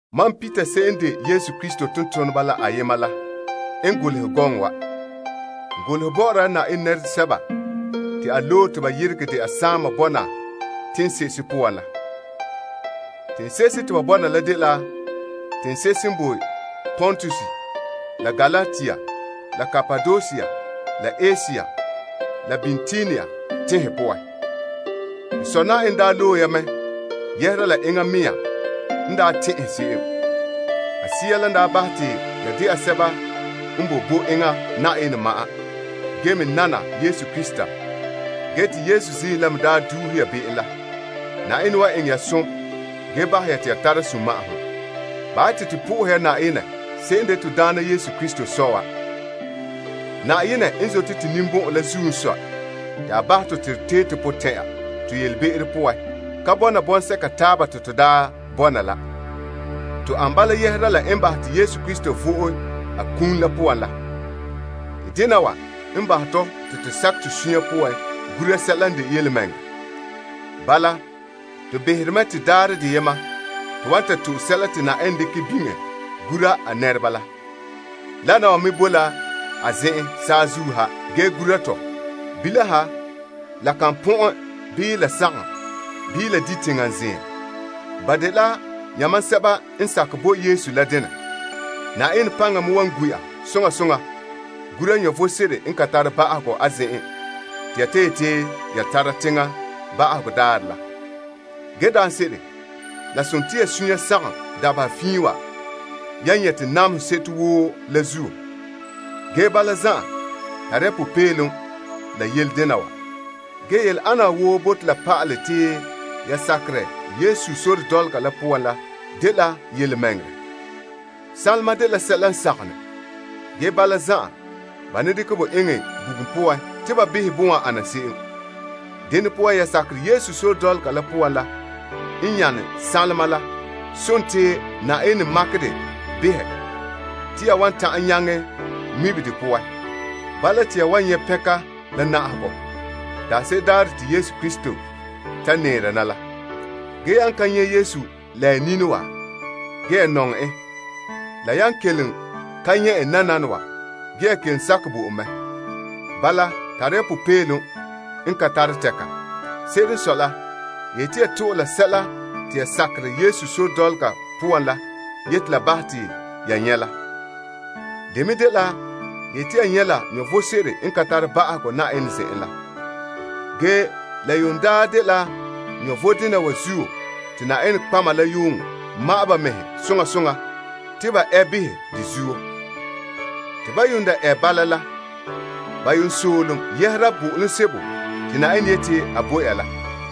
Mam Peter se'em n de Yesu Krista tontoneba la ayema la n golehɛ gɔŋɔ wa. N golehɛ bɔ'ɔra la Na'ayenɛ nɛresɛba te a loe te ba yeregɛ dɛna saama bɔna teŋse'ehe poan la. Teŋse'ehe te ba bɔna la dela teŋse'ehe n boe Pontus, la Galatia, la Kapadosia, la Asia, la Bitinia teŋhe poan. To Sɔ' Na'ayenɛ daa loe ya mɛ yɛhera la enŋa mea n daa tɛn'ɛhɛ se'em. A Sea la n daa bahɛ te ya dɛna sɛba n boe bo enŋa Na'ayenɛ ma'an ge me nana Yesu Krista ge te Yesu ziim la me daa duuhe ya be'em la. Na'ayenɛ wan eŋɛ ya som ge bahɛ ya te ya tara sunma'ahom. Bahɛ ya te to bo Na'ayenɛ fara se'em n de to Daana Yesu Krista Sɔ wa. Na'ayenɛ n zote to ninbɔn'ɔn la zuo n sɔe te a bahɛ tɔ te to tee to potɛn'ɛra to yelebe'ero poan ka bɔna bɔŋsɛka taaba te to daa bɔna la. To ana bala yɛhera la n bahɛ te Yesu Krista vo'e a kum la poan la. Te dena wa n bahɛ tɔ te to sakɛ to suunre poan gura sɛla n de yelemɛŋɛrɛ. Bala, to behere mɛ te daarɛ deyena, to wan ta to'e sɛla te Na'ayenɛ dekɛ biŋe gura a nɛreba la. Wana wa me boe la a zen'en saazuo ha ge gura to. Bilam ha la kan pɔn'ɛn bii la sagom bii la di' teŋa zeem. Ba dela ya mam sɛba n sakɛ bo Yesu la denɛ. Na'ayenɛ paŋa me wa gu' ya soŋa soŋa gura vom sebo n ka tare ba'ahegɔ a zen'en te ya yete ya ta tara teŋa ba'ahegɔ daarɛ la. Daanse'ere, la sone te ya suunre sagom dabeha fiin wa yan nyɛte namehe seto woo la zuo. Ge bala zan'an, tare ya popeelom la yele dena wa. Yele ana wa woo bote la pa'alɛ te ya sakerɛ Yesu sore dɔlɔga la poan la dela yelemɛŋɛrɛ. Sanlema dela sɛla n sagom ne. Ge bala zan'an ba ne dekɛ bo eŋɛ bugum poan te ba behɛ bon wan ana se'em. Dene poan ya sakerɛ Yesu sore dɔlɔga la poan la n nyane sanlema, la sontii Na'ayenɛ makerɛ de behɛ te ya wan ta'an nyaŋɛ ŋmibe de poan. Bala te ya wan nyɛ' pɛnka, la na'ahegɔ, la daanse'ere daarɛ te Yesu Krista ta nɛɛra na la. Yan ka nyɛ' Yesu la ya nini wa, ge ya nɔŋɛ en. La yan kelom ka nyɛ' en nananawa, ge ya kelom sakɛ bo en mɛ. Bala, tara ya popeelom n ka tare tɛka. Se'ere n sɔe la, ya yeti ya to'e la sɛla te ya sakerɛ Yesu sore dɔlɔga poan la yeti la bahɛ ya te ya nyɛ' la. Ya wan nyɛ' faanrɛ se'em n bala. La yuun dela faanrɛ dena wa zuo te nɔtɔgɔheba la yuun ma'ɛn ba mɛhe soŋa soŋa te ba ɛ behɛ de zuo. Te ba yuun ɛ bala la, ba yuun soolom doohe zo'ohogɔ sebo te Na'ayenɛ yeti a bo ya la.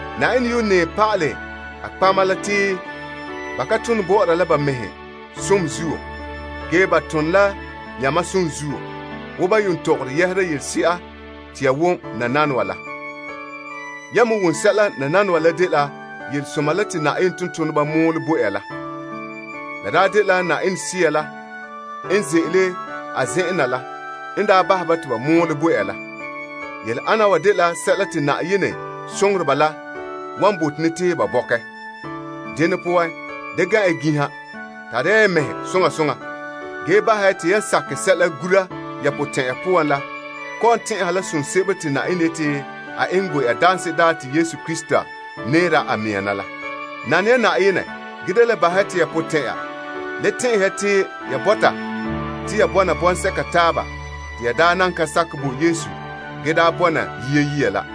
Na'ayenɛ yuun nɛɛ pa'alɛ a nɔtɔgɔheba la te ba ka tone bɔ'ɔra la ba mɛhe som zuo. Ge, ba tone la yamam som zuo wo ban yuun tɔgɔre yɛhera yelese'a te ya wom nananawa la. Ya me wom sɛla nananawa la dela yelesoma la te Na'ayenɛ tontoneba mɔɔlɛ bo ya la. La daa dela Na'ayenɛ Sea la n ze'ele a zen'an na la n daa bahɛ ba te ba mɔɔlɛ bo ya la. Yele ana wa dela sɛla te Na'ayenɛ soŋoreba la wan bote ne te ba bɔkɛ. Dene poan, da gan' ya ginha. Tare ya ya mɛhe soŋa soŋa ge bahɛ ya te yan sakɛ sɛla gura ya potɛn'ɛre poan la kɔ'ɔn tɛn'ɛha la som sebo te Na'ayenɛ yeti a eŋɛ bo ya daanse'ere daarɛ te Yesu Krista nɛɛra a mɛŋa na la. Nane ya Na'ayenɛ ge da le bahɛ ya te ya potɛn'ɛra le tɛn'ɛhɛ ya te ya bɔta te ya bɔna bɔŋsɛka taaba te ya daa nan ka sakɛ bo Yesu gee daa bɔna yia saŋa la,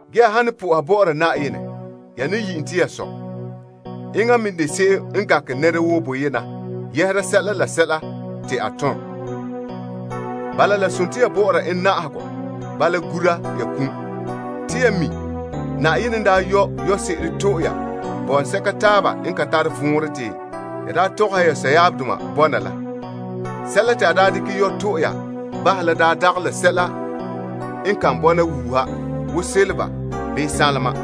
Ya han ne soha Na'ayenɛ, ya ne yi' en te ya Sɔ'. Enŋa n me de se'em n gankere nɛra woo boyena yɛhera sɛla te nɛra woo tom. Bala, la sontii ya bɔ'ɔra na'ahegɔ bala gura ya kum. Te ya mi' Na'ayenɛ n daa yɔ' yɔse'ere to'e ya bɔŋsɛka taaba n ka tare vɔnrɛ te ya daa tɔgɔhɛ ya sɔyaabdoma bɔna la. Sɛla te a daa dekɛ yɔ' to'e ya bahɛ la daa dagɛ la sɛla n kan bɔna wuuha wo sanlenpeelega bii sanlema.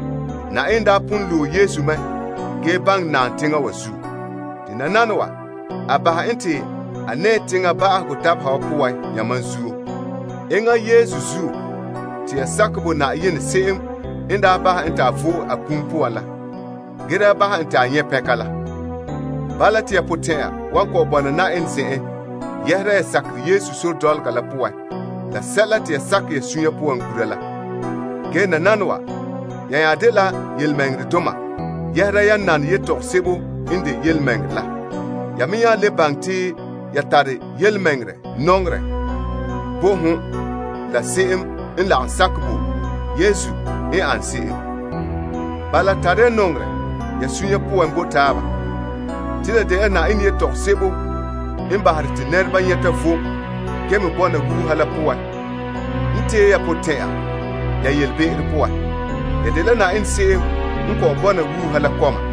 Na'ayenɛ daa pon loe Yesu mɛ gee baŋɛ naam teŋa wa zuo. Te nananawa, a bahɛ en te a nɛɛ teŋa ba'ahegɔ dabeha wa poan yamam zuo. Enŋa Yesu zuo te ya sakɛ bo Na'ayenɛ se'em n daa bahɛ en te a vo'e a kum poan la ge daa bahɛ en te a nyɛ' pɛnka la. Bala, te ya potɛn'ɛra wan kɔ'ɔn bɔna Na'ayenɛ zen'en yɛhera ya sakerɛ Yesu sore dɔlɔga la poan la sɛla te ya sakɛ ya suunre poan gura la. Nananawa, ya nya dela yelemɛŋɛrɛdoma yɛhera yan nane yetɔgom sebo n de yelemɛŋɛrɛ la. Ya me nya le baŋɛ te ya tare yelemɛŋɛrɛ nɔŋerɛ bo hon la se'em n lagom sakɛ bo Yesu n ane se'em. Bala, tara ya nɔŋerɛ ya suunre poan bo taaba. Te la dela Na'ayenɛ yetɔgom sebo n bahere te nɛreba nyɛta vom ge me bɔna wuuha la n bahɛ te ya dɛna nɛrepaalehe. Ya dela Na'ayenɛ se'em n kɔ'ɔn bɔna wuuha la kɔma.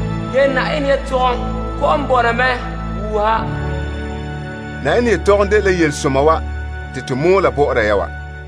Ge Na'ayenɛ yelehom boe la wuuha. Na'ayenɛ yelehom dela yelesoma wa te to mɔɔla bɔ'ɔra ya wa.